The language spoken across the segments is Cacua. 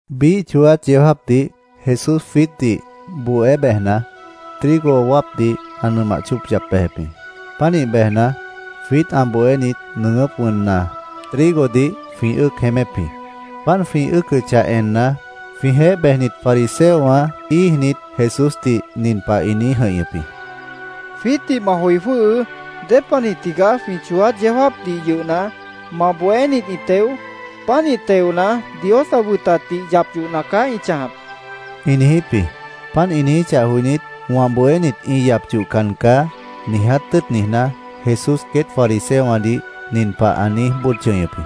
Biíh chooát yeó jáapdih Jesús jwiítdih bohé bejna, trigo wáapdih ã nʉmah chóop yap bejep jĩ. Pánih bejna, jwiít ã bohénit nʉʉgʉ́p wʉnna, trigodih jwĩ ʉ́ʉc jeémép jĩ. Páant jwĩ ʉ́ʉcʉchah enna, jwĩjeéh bejnit fariseowã íijnit, Jesúsdih nin pah ĩ niíj jʉ̃ihñʉp jĩ: —Jwiítdih ma joi jwʉ́hʉʉ́. ¿Dépanih tigaá jwĩ chooát yeó jáapdih yʉhna, ma bohénit ĩ teo? Pánih teona, Dios ã wʉtatdih yap yohna caá ĩ chãjap, ĩ niijíp jĩ. Páant ĩ niijíchah joinít, “Wã bohénit ĩ yap yohcan caá”, niiját tʉ́ʉt niijná, Jesús queét fariseowãdih nin pah ã niíj bóod chʉñʉp jĩ: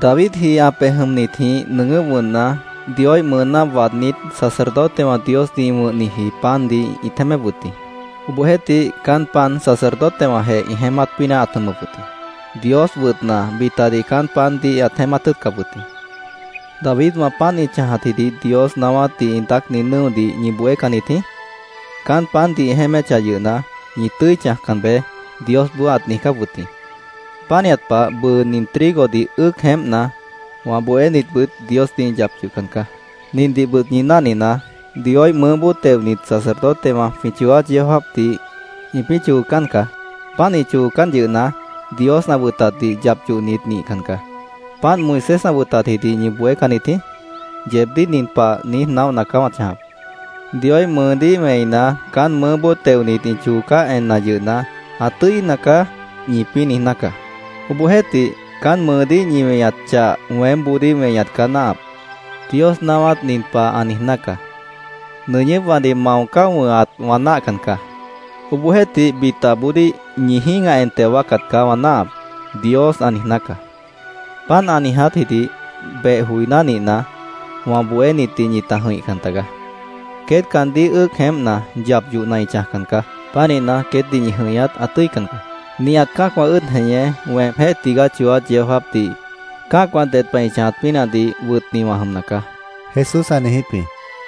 —Davidji ã pej jʉmnitjĩh nʉʉgʉ́p wʉnna, Dioíh mʉʉná waadnít, sacerdotewã Diosdih ĩ wʉ̃hniji pandih ĩt jeémép wʉt jĩ. Obohjeéhtih, caán pan sacerdotewãjeh ĩ jeémát pínah ãt jʉmʉp wʉt jĩ. Dios wʉtna, bitadih caán pandih ãt jeémát tʉ́ʉtcap wʉt jĩ. ¿Davidwã páant ĩ chãjatjidih Dios naáwátdih ĩ daácni nʉ́odih ñi bohécannit jĩí? Caán pandih ĩ jeéméchah yʉhna, ‘Ñi tʉ́i chãjcan beé’, Diosboó ãt niijcáp wʉt jĩ. Pánihat pah, bʉʉ nin trigodih ʉ́ʉc jeémpna, wã bohénitbʉt Diosdih ĩ yap yohcan caá. Nindihbʉt ñi náhninaá: Dioíh mʉʉ́boó teonit sacerdotewã jwĩ chooát yeó jáapdih ĩpĩ́ choocán caá. Páant ĩ choocán yʉhna, Dios ã wʉtatdih yap yohnit nihcan caá. ¿Páant Moisés ã wʉtatjidih ñi bohécannit jĩí? Yeebdíh nin pah niíj naóhna caá wã chãjap: Dioíh mʉʉdíh wẽina, caán mʉʉ́boó teonit ĩ choocáh enna yʉhna, ‘Ã tʉ́ina caá’, ñipĩ́ niijná caá. Obohjeéhtih, caán mʉʉdíh ñi weñat chah weémboodíh weñat caá náahap. Dios naáwát nin pah ã niijná caá: ‘Nʉñʉ́pwãdih mao cáo wʉ̃hat wã náahcan caá. Obohjeéhtih, bitaboodíh ñi jĩ́gah en teo wáacat caá wã náahap’, Dios ã niijná caá.Páant ã niijátjidih beh joiná nihna, wã bohénitdih ñita jʉ̃ihcan tagaá. Queét caandíh ʉ́ʉc jeémpna, yap yohna ĩ chãjcan caá. Pánihna, queétdih ñi jʉ̃ihñat ã tʉ́ican caá. Nihat cã́acwã ʉ́ʉd jeñé, weemjéh tigaá chooát yeó jáapdih cã́acwã ded pah ĩ chãjat pínahdih wʉtni wã jʉmna caá, Jesús ã niijíp jĩ.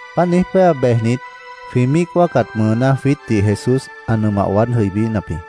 Páant niíj péa, bejnit, jwĩ míic wáacat mʉʉná jwiítdih Jesús ã nʉmah waád jʉibínap jĩ.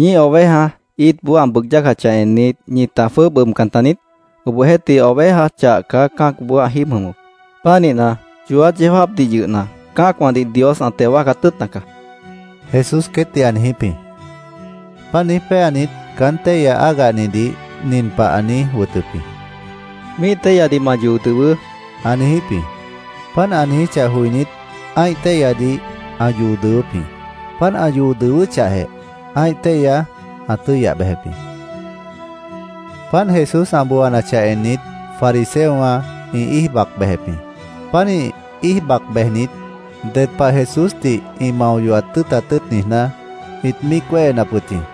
—¿Ñíih oveja íitboó ã bʉʉg yácachah ennit, ñita jwʉ́ʉb ʉbcan taniít? Obohjeéhtih, oveja chah caá cã́acboó ã jíib jʉmʉp. Pánihna, chooát yeó jáapdih yʉhna, cã́acwãdih Dios ã teo wáacat tʉ́ʉtna caá, Jesús queétdih ã niijíp jĩ. Páant niíj péanit, caán téihya ágahnidih nin pah ã niíj wʉtʉp jĩ: —Míih téihyadih ma yoo dʉwʉʉ́, ã niijíp jĩ. Páant ã niijíchah joinít, ã́ih téihyadih ã yoo dʉwʉ́p jĩ. Páant ã yoo dʉwʉ́chahjeh, ã́ih téihya ã tʉ́yah bejep jĩ. Páant Jesús ã booanachah ennit, fariseowã ĩ íij bac bejep jĩ. Pánih íij bac bejnit, ded pah Jesúsdih ĩ mao yohat tʉ́ʉtat tʉ́ʉt niijná, ĩt míic wéhenap wʉt jĩ.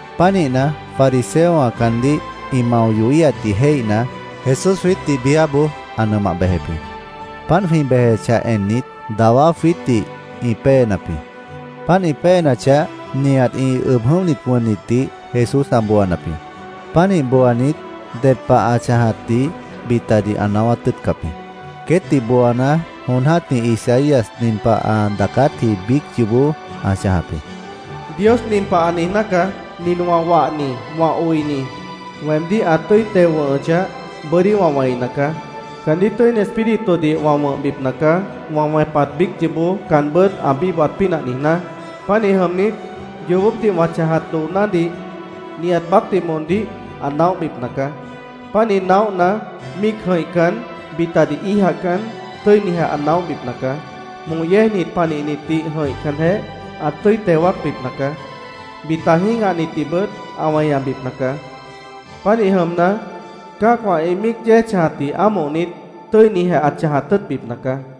Pánihna, fariseowã caandíh ĩ mao yohíhatdih jéihna, Jesús jwiítdih biáboó ã nʉmah bejep jĩ. Páant jwĩ bejechah ennit, dawá jwiítdih ĩ péenap jĩ. Páant ĩ péenachah, nihat ĩ ʉb jʉ̃óhnit wʉnnitdih Jesús ã booanap jĩ. Pánih booanit, ded pah ã chãjatdih bitadih ã naáwát tʉ́ʉtcap jĩ. Queétdih booana, jon jã́tih Isaías nin pah ã daacátji biíc yoobó ã chãjap jĩ: “Dios nin pah ã niijná caá: ‘Nin wã wahni, wã oini, weemdíh ã tʉ́i teo wʉ̃hʉchah, bʉ́dí wã wẽina caá. Caandíh Tʉ́ini Espíritudih wã wʉ̃hbipna caá, wã wẽpat biíc yoobó caanbʉ́t ã bíbohat pínah niijná. Pánih jʉmnit, yoobópdih wã chãjat doonádih nihat baácdih moondíh ã naóhbipna caá. Pánih naóhna, míic jʉ̃ihcan, bitadih íijacan, tʉ́inijeh ã naóhbipna caá. Moh yéejnit panihnitdih jʉ̃ihcanjeh, ã tʉ́i teo wáacbipna caá. Bita jĩ́gahnitdihbʉt ã weñabipna caá. Pánih jʉmna, cã́acwã ĩ míic yéej chãjatdih ámohnit, tʉ́inijeh ã chãjat tʉ́ʉtbipna caá.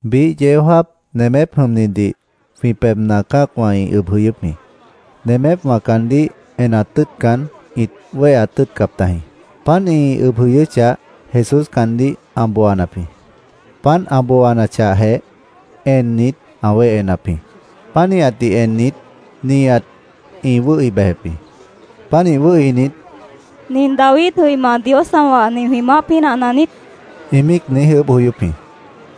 Biíh yeó jáap nemép jʉmnidih jwĩ pebhna cã́acwã ĩ ʉb jʉyʉ́p jĩ. Nemépwã caandíh enat tʉ́ʉtcan, ĩt wéheat tʉ́ʉtcap tajĩ. Páant ĩ ʉb jʉyʉ́chah, Jesús caandíh ã booanap jĩ. Páant ã booanachahjeh, ennit, ã wéhenap jĩ. Pánihatdih ennit, nihat ĩ wʉ́hi bejep jĩ. Pánih wʉ́hinit, “¿Nin David jʉima, Dios ã wahni, jwĩ maáh pínahna niít?” ĩ míic niíj ʉʉ́bh joyóp jĩ.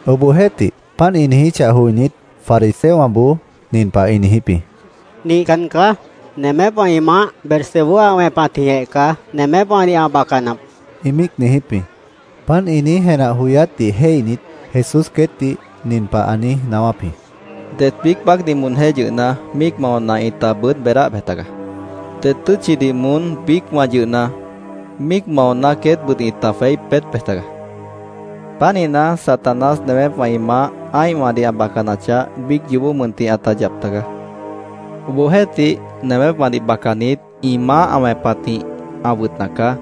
Obohjeéhtih, páant ĩ niijíchah joinít, fariseowãboó nin pah ĩ niijíp jĩ: “Nihcan caá. Nemépwã ĩ maáh Beelzebú ã wẽpatjĩhjeh caá nemépwãdih ã bacanap”, ĩ míic niijíp jĩ. Páant ĩ niíj jenah joyátdih jéihnit, Jesús queétdih nin pah ã niíj naáwáp jĩ: “Det biíc baácdih moonjéh yʉhna, míic maona, ĩta wʉn beedáh bej tagaá. Det tʉ́tchidih moón biícwã yʉhna, míic maona, queétbʉt ĩta jweí peét bej tagaá. Pánihna, Satanás, nemépwã ĩ maáh ã́ihwãdih ã bacanachah, biíc yoobó mʉntih ãta yap tagaá. Obohjeéhtih, ‘nemépwãdih bacanit, ĩ maáh ã wẽpatjĩh ã wʉtna caá’,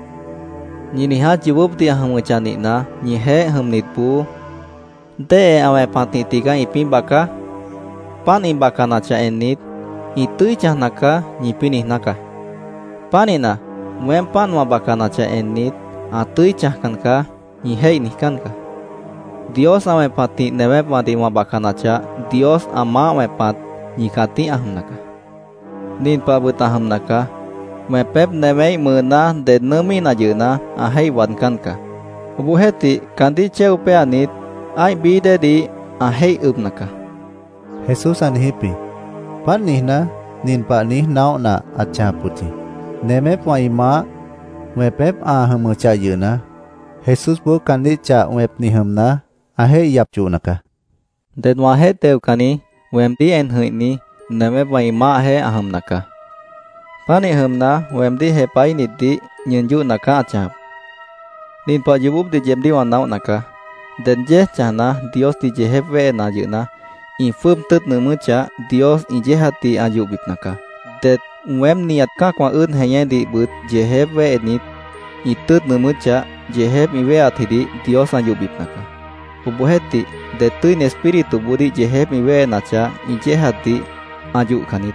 ñi niiját yoobópdih ã jʉmʉchah nihna, ñijeéh jʉmnitboó ¿déhe ã wẽpatjĩh tigaá ĩpĩ́ baca? Páant ĩ bacanachah ennit, ‘Ĩ tʉ́i chãjna caá’, ñipĩ́ niijná caá. Pánihna, weém páant wã bacanachah ennit, ‘Ã tʉ́i chãjcan caá’, ñi jéih niijcán caá. Dios ã wẽpatjĩh nemépwãdih wã bacanachah, Dios ã maáh wẽpat ñi cãtíh ã jʉmna caá. “Nin pahbʉt ã jʉmna caá: Wẽpép newéíh mʉʉná ded nʉʉ́míhna yʉhna, ã jéih waadcán caá. Obohjeéhtih, caandíh chéo péanit, ã́ih bií déedih ã jéih ʉbna caá”, Jesús á niijíp jĩ. Páant niijná, nin pah niíj naóhna ãt chãjap wʉt jĩ: Nemépwã ĩ maáh wẽpép ã jʉmʉchah yʉhna, Jesúsboó caandíh chah wẽpni jʉmna, ã jéih yap yohna caá. “Ded wãjeéh teocanni, weemdíh en jʉ̃ihni, nemépwã ĩ maáhjeéh ã jʉmna caá. Pánih jʉmna, weemdíh jepahíhnitdih ñʉʉn yóhna caá ã chãjap. “Nin pah yoobópdih yeebdíh wã naóhna caá: Det yéej chãjna, Diosdih yeejép wéhena yʉhna, ĩ jwʉ́ʉb tʉ́ʉt nʉʉmʉ́chah, Dios ĩ yéejatdih ã yohbipna caá. Det weém nihat cã́acwã ʉ́ʉd jeñédihbʉt yeejép wéhenit, ĩ tʉ́ʉt nʉʉmʉ́chah, yeejép ĩ wéheatjidih Dios ã yohbipna caá. Obohjeéhtih, det Tʉ́ini Espírituboodíh yeejép ĩ wéhenachah, ĩ yéejatdih ã yohcan niít.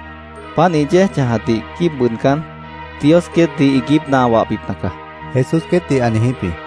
Páant ĩ yéej chãjatdih quíib bʉʉdcán, Dios queétdih iiguípna ã wahbipna caá”, Jesús queétdih ã niijíp jĩ.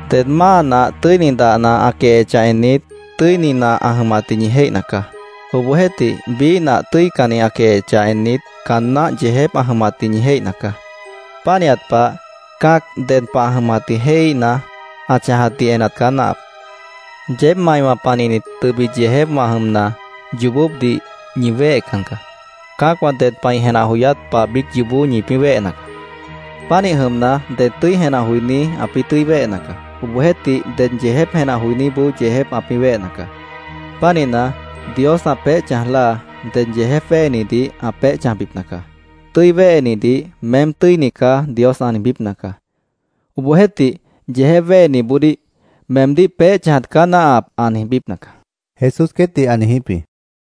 “Ded máa nah tʉ́ini dahna ã quehechah ennit, tʉ́ini nah ã jʉmatdih ñi jéihna caá. Obohjeéhtih, biíh nah tʉ́icanni ã quehechah ennit, caan náh yeejép ã jʉmatdih ñi jéihna caá. Pánihat pah, cã́ac ded pah ã jʉmatdih jéihíhna, ã chãjatdih enat caá náahap. Yeéb maiwã panihnit tʉbit yeejépwã jʉmna, yoobópdih ñi wéhecan caá.Cã́acwã ded pah ĩ jenah joyát pah biíc yoobó ĩpĩ́ wéhena caá. Pánih jʉmna, ded tʉ́i jenah joiní ãpĩ́ tʉ́i wéhena caá. Obohjeéhtih, ded yeejép jenah joiníboó yeejép ãpĩ́ wéhena caá. Pánihna, Dios ã peéh chãj láa ded yeejép wéhenidih ã peéh chãjbipna caá. Tʉ́i wéhenidih ‘Meém tʉ́ini caá’, Dios ã niijbípna caá. Obohjeéhtih, yeejép wéheniboodíh ‘Meemdíh peéh chãjat ã náahna caá’, ã niijbípna caá”, Jesús queétdih ã niijíp jĩ.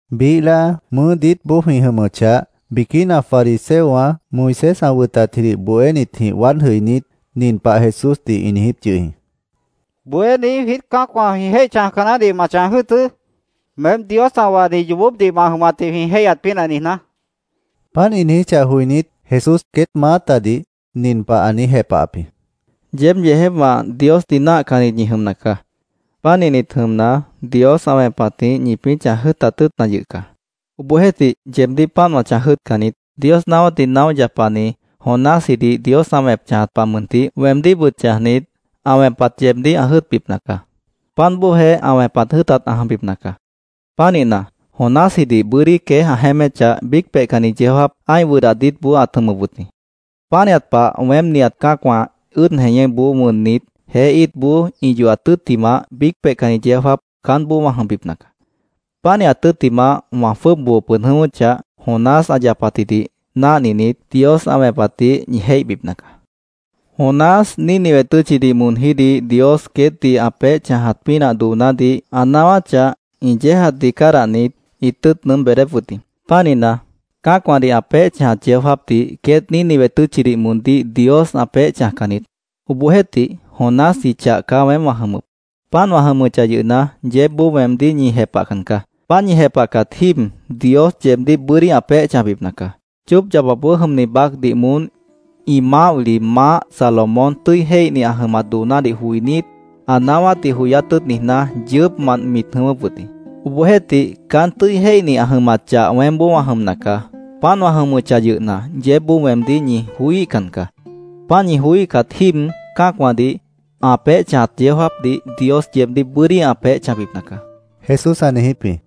Biíh láa mʉʉ́ diítboó jwĩ jʉmʉchah, biquína fariseowã, Moisés ã wʉtatjidih bohénitjĩh waád jʉinít, nin pah Jesúsdih ĩ niijíp yʉh jĩ: —Bohéní, jwiít cã́acwã jwĩ jéih chãjca naáhdih ma chãj jʉ́ʉtʉ́, meém Dios ã wahni yoobópdih ma jʉmatdih jwĩ jéihyat pínah niijná, ĩ niijíp jĩ. Páant ĩ niijíchah joinít, Jesús queét maátadih nin pah ã niíj jepahap jĩ: —Yeéb yeejépwã Diosdih náahcannit ñi jʉmna caá. Pánihnit jʉmna, Dios ã wẽpatjĩh ñipĩ́ chãj jʉ́ʉtat tʉ́ʉtna yʉh caá. Obohjeéhtih, yeebdíh páant wã chãj jʉ́ʉtcan niít. Dios naáwátdih naóh yapani Jonásjidih Dios ã wẽp chãjat pah mʉntih weemdíhbʉt chãjnit, ã wẽpat yeebdíh ã jʉ́ʉtbipna caá. Páant bóojeh ã wẽpat jʉ́ʉtat ã jʉmbipna caá. Pánihna, Jonásjidih bʉ́dí queéj ã jeéméchah, biíc peihcanni yeó jáap ã́ih wʉdah diítboó ãt jʉmʉp wʉt jĩ. Pánihat pah weém nihat cã́acwã ʉ́ʉd jeñéboó wʉnnit, jeé íitboó ĩ yohat tʉ́ttimah, biíc peihcanni yeó jáap caánboó wã jʉmbipna caá. Pánihat tʉ́ttimah, wã jwʉ́ʉb boo pʉd jʉ̃ʉ́wʉ́chah, Jonás ã yapatjidih náhninit, Dios ã wẽpatdih ñi jéihbipna caá. Jonás Nínive tʉ́tchidih moonjídih Dios queétdih ã peéh chãjat pínah doonádih ã naáwáchah, ĩ yéejatdih cádahnit, ĩt tʉ́ʉt nʉʉ́m beedép wʉt jĩ. Pánihna, cã́acwãdih ã peéh chãjat yeó jáapdih queét Nínive tʉ́tchidih moondíh Dios ã peéh chãjcan niít. Obohjeéhtih, Jonásji chah caá weém wã jʉmʉp. Páant wã jʉmʉchah yʉhna, yeébboó weemdíh ñi jepahcan caá. Páant ñi jepahcat jíib Dios yeebdíh bʉ́dí ã peéh chãjbipna caá. Chóop yapapboó jʉmni baácdih moón ĩ maáh wili maáh Salomón tʉ́i jéihni ã jʉmat doonádih joinít, ã naáwátdih joyát tʉ́ʉt niijná, yʉʉ́pmant mit jʉ̃ʉ́wʉ́p wʉt jĩ. Obohjeéhtih, caán tʉ́i jéihni ã jʉmat chah weémboó wã jʉmna caá. Páant wã jʉmʉchah yʉhna, yeébboó weemdíh ñi joííhcan caá. Páant ñi joííhcat jíib cã́acwãdih ã peéh chãjat yeó jáapdih Dios yeebdíh bʉ́dí ã peéh chãjbipna caá, Jesús ã niijíp jĩ.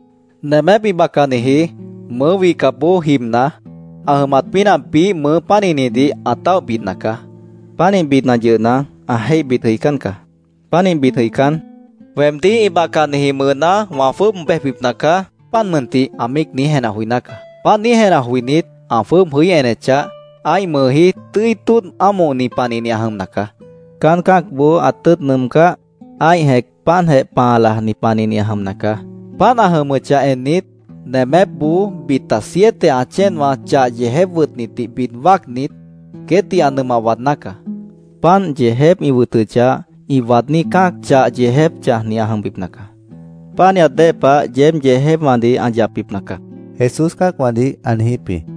“Nemép ĩ bacaniji, mʉʉ́ wihcapboó jibna, ã jʉmat pínah biíh mʉʉ pánihnidih ã táoh bidna caá. Pánih bidna yʉhna, ã jéih bid jʉicán caá. Pánih bid jʉicán, ‘Weemdíh ĩ bacaniji mʉʉná wã jwʉ́ʉb bejbipna caá, páant mʉntih’, ã míic niíj jenah joiná caá. Páant niíj jenah joinít, ã jwʉ́ʉb jʉí enechah, ã́ih mʉʉjí tʉ́i tóodh ámohni panihni ã jʉmna caá. Caán cã́acboó ã tʉ́ʉt nʉʉmcáh, ã́ih jẽc páantjeh pãa lajni panihni ã jʉmna caá. Páant ã jʉmʉchah ennit, nemépboó bita siete ã chéenwã chah yeejép wʉtnitdih bid wáacnit, queétdih ã nʉmah waadná caá. Páant yeejép ĩ wʉtʉchah, ĩ waadní cã́ac chah yeejép chãjni ã jʉmbipna caá. Pánihat dée pah yeéb yeejépwãdih ã yapbipna caá”, Jesús cã́acwãdih ã niijíp jĩ.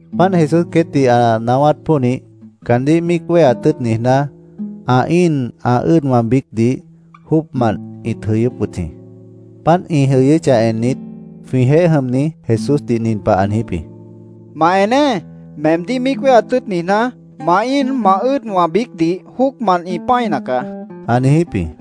Páant Jesús queétdih ã naáwát pónih, caandíh míic wéheat tʉ́ʉt niijná, ã íin ã ʉ́ʉdwã biícdih jóocmant ĩt jʉyʉ́p wʉt jĩ. Páant ĩ jʉyʉ́chah ennit, jwĩjeéh jʉmni Jesúsdih nin pah ã niijíp jĩ: —¡Ma eneé! Meemdíh míic wéheat tʉ́ʉt niijná, ma íin ma ʉ́ʉdwã biícdih jóocmant ĩ pã́ina caá, ã niijíp jĩ.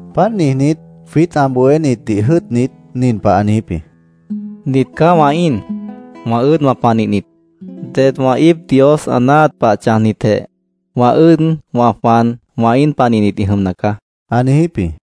Páant niijnít, jwiít ã bohénitdih jʉ́ʉtnit, nin pah ã niijíp jĩ: —Nit caá wã íin, wã ʉ́ʉdwã panihnit. Det wã íip Dios ã náahat pah chãjnitjeh wã ʉ́ʉd, wã jwan, wã íin panihnit ĩ jʉmna caá, ã niijíp jĩ.